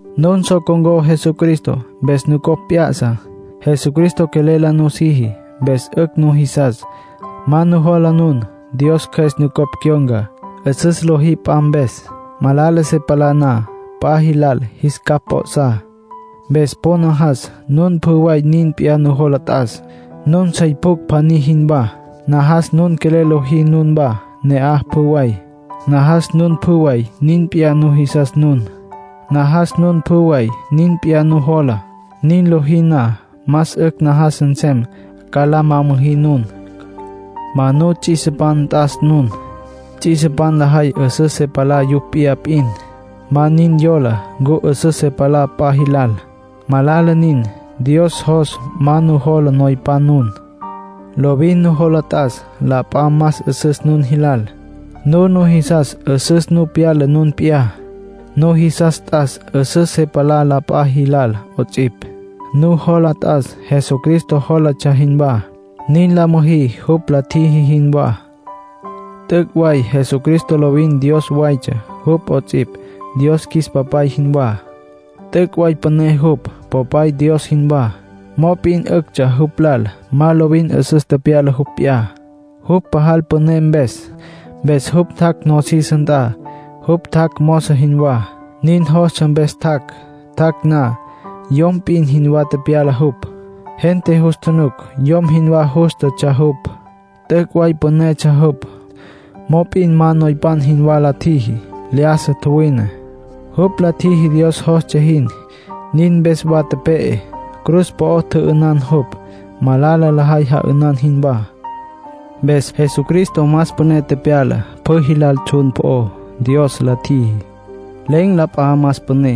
Nun so con̈có Jesucristo, mpes nucopj p'ya'sa. Jesucristo quelel la nusiji, mpes 'ücj nujisas, ma nujola nun. Dios Cjües nucopj cyon̈ca. 'Üsüs lojí p'a mpes. Malala se palá na p'a jilal, jis capj p'o'sá. Mpes po najas nun pjü way nin p'iyá nujola t'as, nun sey pjucj pjaní jinwá. Najas nun quelel la lojí nunwá ne'aj, pjü way. Najas nun pjü way nin p'iyá nujisas nun. Najas nun pjü way nin p'iyá nujola. Nin lojí na, más 'ücj najas nsem ca la ma müjí nun. Ma nuts'isipan t'as nun. Ts'isipan lajay 'üsüs se palá yupj p'iyá p'in. Ma nin yola ncu 'üsüs se palá p'a jilal. Malala nin. Dios jos ma nujola noypan nun. Lovin nujola t'as la p'a más 'üsüs nun jilal. Nun nujisas 'üsüs nu pyala nun p'iyá. Nujisas t'as 'üsüs se palá la p'a jilal 'ots'ipj. Nujola t'as Jesucristo jólatsja jinwá. Nin la müjí jupj la tjiji jinwá. T'üc' way Jesucristo lovin Dios waytsja jupj 'ots'ipj, Dios qjuis Papay jinwá. T'üc' way püné jupj, Popay Dios jinwá, mop'in 'üctsja jupj lal ma lovin 'üsüs tepyala jupj p'iyá, jupj pajal püné mpes. Mpes jupj tjac' nosis nt'a. Jupj tjac' mozo jinwá. Nin jostsja, mpes tjac'. Tjac' na, yom p'in jinwá tepyala jupj. Gente jus tjunuc yom jinwá jústatsja jupj. T'üc' way pünetsja jupj, mop'in ma noypan jinwá la tjiji. Lyájasa tjuwine. Jupj la tjiji Dios jostsja jin. Nin mpes wa tepe'e. Cruz po'o tjü'ünan jupj, malala lajay ja'ünan jinwá. Mpes Jesucristo más püné tepyala pjü jilal tsjun po'ó, Dios la tjiji. Len̈ la p'a más püné.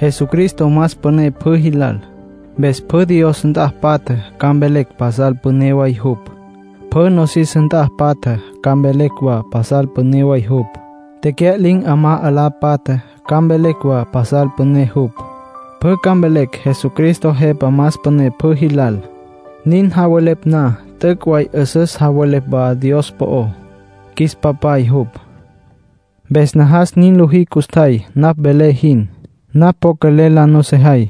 Jesucristo más püné pjü jilal, mpes pjü Dios nt'a patja ca mvelecj pasal püné way jupj. Pjü nosis nt'a patja ca mvelecj wa pasal püné way jupj. Tecya'lin̈ 'amá 'alá patja ca mvelecj wa pasal püné jupj. Pjü ca mvelecj Jesucristo Jepa más püné pjü jilal. Nin javelepj na, t'üc' way 'üsüs javelepj wa Dios po'ó, qjuis Papay jupj. Mpes najas nin lojí custjay, napj velé jin. Napj po quelel la nusejay.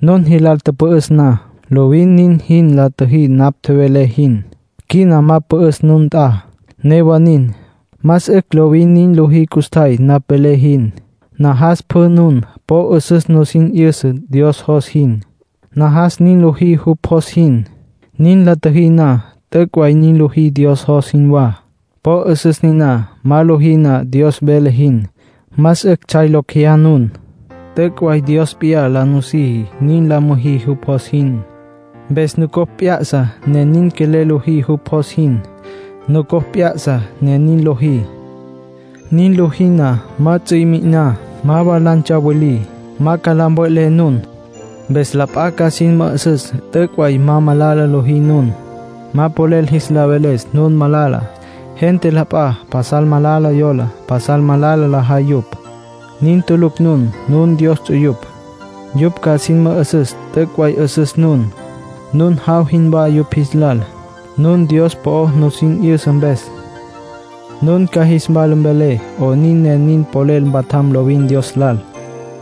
Nun jilal tüpü'üs na, lovin nin jin la tjüjí napj tjevelé jin. Quina ma pü'üs nun nt'a; newa nin, más 'ücj lovin nin lojí custjay napj velé jin. Najas pjü nun po 'üsüs nusin 'yüsa Dios jos jin. Najas nin lojí jupj jos jin. Nin la tjüjí na, t'üc' way nin lojí Dios jos jinwá. Po 'üsüs niná. Ma lojí na Dios vele jin, más 'ücj tsjay locj jeyá nun. T'üc' way Dios p'iyá la nusiji nin la müjí jupj jos jin. Mpes nucopj p'ya'sa, ne nin quelel lojí jupj jos jin. Nucopj p'ya'sa, ne nin lojí. Nin lojí na, ma ts'i mi'iná, ma wa la ntsawilí. Ma ca la mve'lé nun. Mpes la p'a ca sin mü'üsüs t'üc' way ma malala lojí nun. Ma polel jis la veles nun malala. Gente la p'a pasal malala yola. Pasal malala lajay yupj. Nin tulucj nun. Nun Dios ts'uyupj. Yupj ca sin mü'üsüs t'üc' way 'üsüs nun. Nun jaw jinwá yupj jis lal, nun Dios po'o nusin 'yüsa mpes. Nun ca jis wala mvelé 'onin ne nin polel mpatjam lovin Dios lal.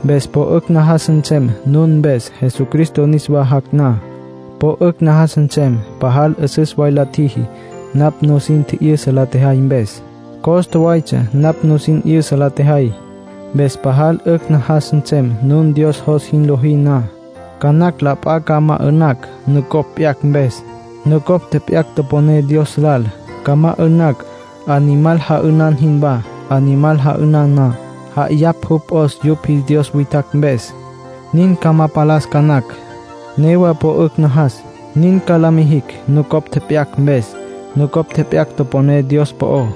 Mpes po 'ücj najas nsem nun mpes Jesucristo niswa jac' na. Po 'ücj najas nsem pajal 'üsüs way la tjüjí, napj nusin tji'yüsa la tjejay mpes. Costa waytsja napj nusin 'yüsa la tjejay. Mpes pajal 'ücj najas nsem nun Dios jos jin lojí na. Ca nacj la p'a ca ma 'ü'nacj, nucopj tjep'yacj mpes; nucopj tjep'yacj toponé Dios lal. Ca ma 'ü'nacj, animal ja'ünan jinwá. Animal ja'ünan na, ja'ayapj jupj 'os yupj jis dios witjacj mpes. Nin ca ma palas ca nacj, newa po 'ücj najas. Nin ca la mijicj nucopj tjep'yacj mpes, nucopj tjep'yacj toponé Dios po'ó.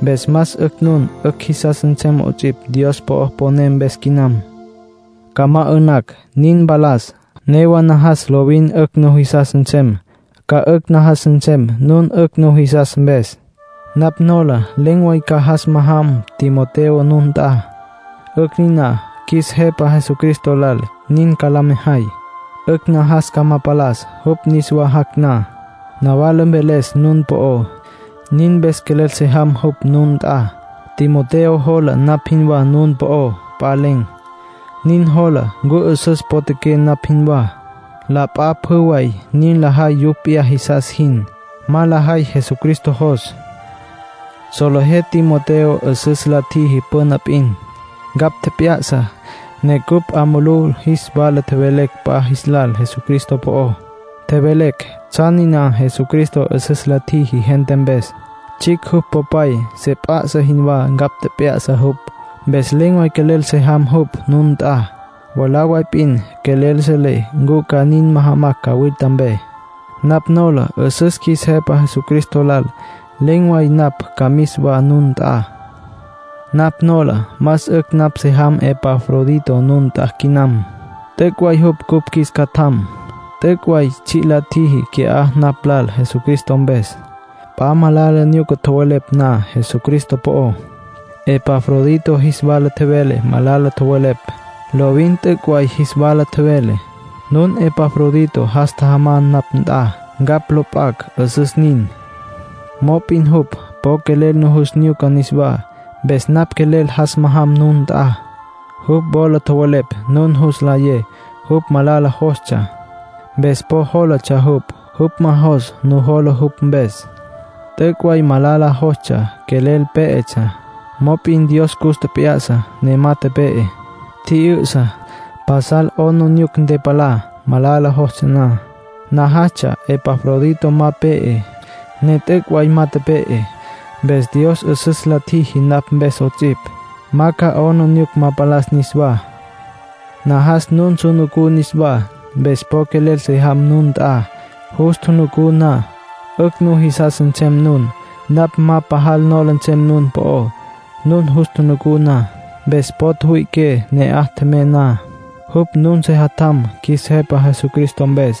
Mpes más 'ücj nun 'ücj jisas nsem 'ots'ipj Dios po'o poné mpes quinam. Ca ma 'ü'nacj, nin mpalas; newa najas lovin 'ücj nujisas nsem. Ca 'ücj najas nsem, nun 'ücj nujisas mpes. Napj nola len̈ way ca jas majam Timoteo nun nt'a. 'Ücj niná qjuis Jepa Jesucristo lal, nin ca la mejay. 'Ücj najas ca ma palas, jupj niswa jac' na, nawala mveles nun po'ó; nin mpes quelel se jam jupj nun nt'a. Timoteo jola napj jinwá nun po'ó. P'a len̈. Nin jola ncu 'üsüs potjaqué, napj jinwá. La p'a pjü way nin lajay yupj p'iyá jisas jin. Ma lajay Jesucristo jos. Solejé Timoteo 'üsüs la tjiji püna p'in. Ncapj tjep'ya'sa, ne cupj 'a mulú jis wala tjevelecj la p'a jis lal Jesucristo po'ó. Tjevelecj tsjan niná Jesucristo 'üsüs la tjiji gente mpes. Tsjicj jupj popay se p'a'sa jinwá ncapj tjep'ya'sa jupj. Mpes len̈ way quelel se jam jupj nun nt'a. Mwalá way p'in quelel selé ncu ca nin majamacj cawilta mpe. Napj nola 'üsüs qjuis Jepa Jesucristo lal len̈ way napj ca mis wa nun nt'a. Napj nola más 'ücj napj se jam Epafrodito nun nt'a quinam. T'üc' way jupj cupj qjuis catjam. T'üc' way tsji' la tjiji qui'á napj lal Jesucristo mpes. P'a malala nyuca tjowelepj na Jesucristo po'ó, Epafrodito jis wala tjevele malala tjowelepj. Lovin t'üc' way jis wala tjevele. Nun Epafrodito jas tjajamá napj nt'a, ncapj lo p'acj. 'Üsüs nin. Mop'in jupj po quelel nujus nyuca niswá, mpes napj quelel jas majam nun nt'a. Jupj wola tjowelepj nun jus nlayé jupj malala jostsja, mpes po jólatsja jupj. Jupj ma jos nujola jupj mpes. T'üc' way malala jostsja, quelel pé'etsja. Mop'in Dios cus tjep'ya'sa, ne ma tepe'e. Tji'yü'sa. Pasal 'aplijila ntepalá, malala jostsja na. Najastsja Epafrodito ma pe'e, ne t'üc' way ma tepe'e. Mpes Dios 'üsüs la tjiji napj mpes 'ots'ipj, ma ca 'aplijila ma palas niswá. Najas nun su nucú niswá, mpes po quelel se jam nun nt'a. Jus tjunucú na, 'ücj nujisas nsem nun. Napj ma pajal nola nsem nun po'ó, nun jus tjunucú na. Mpes po tjüwüi'iqué ne'aj tjemey na; jupj nun sejatjam, qjuis Jepa Jesucristo mpes.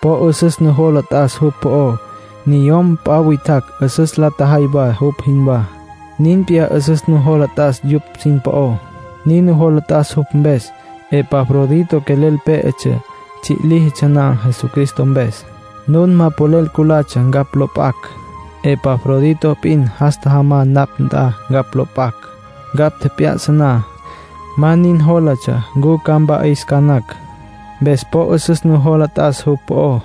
Po 'üsüs nujola t'as jupj po'ó. Niyom p'a witjacj 'üsüs la tjajay wa jupj jinwá, nin p'iyá 'üsüs nujola t'as yupj sin po'ó. Nin nujola t'as jupj mpes; Epafrodito quelel pé'etsja tsji' líjitsja na Jesucristo mpes. Nun ma polel culatsja ncapj lo p'acj; Epafrodito p'in jas tjajamá napj nt'a ncapj lo p'acj. Ncapj tjep'ya'sa na, ma nin jólatsja ncu ca mpa'is ca nacj. Mpes po 'üsüs nujola t'as jupj po'ó.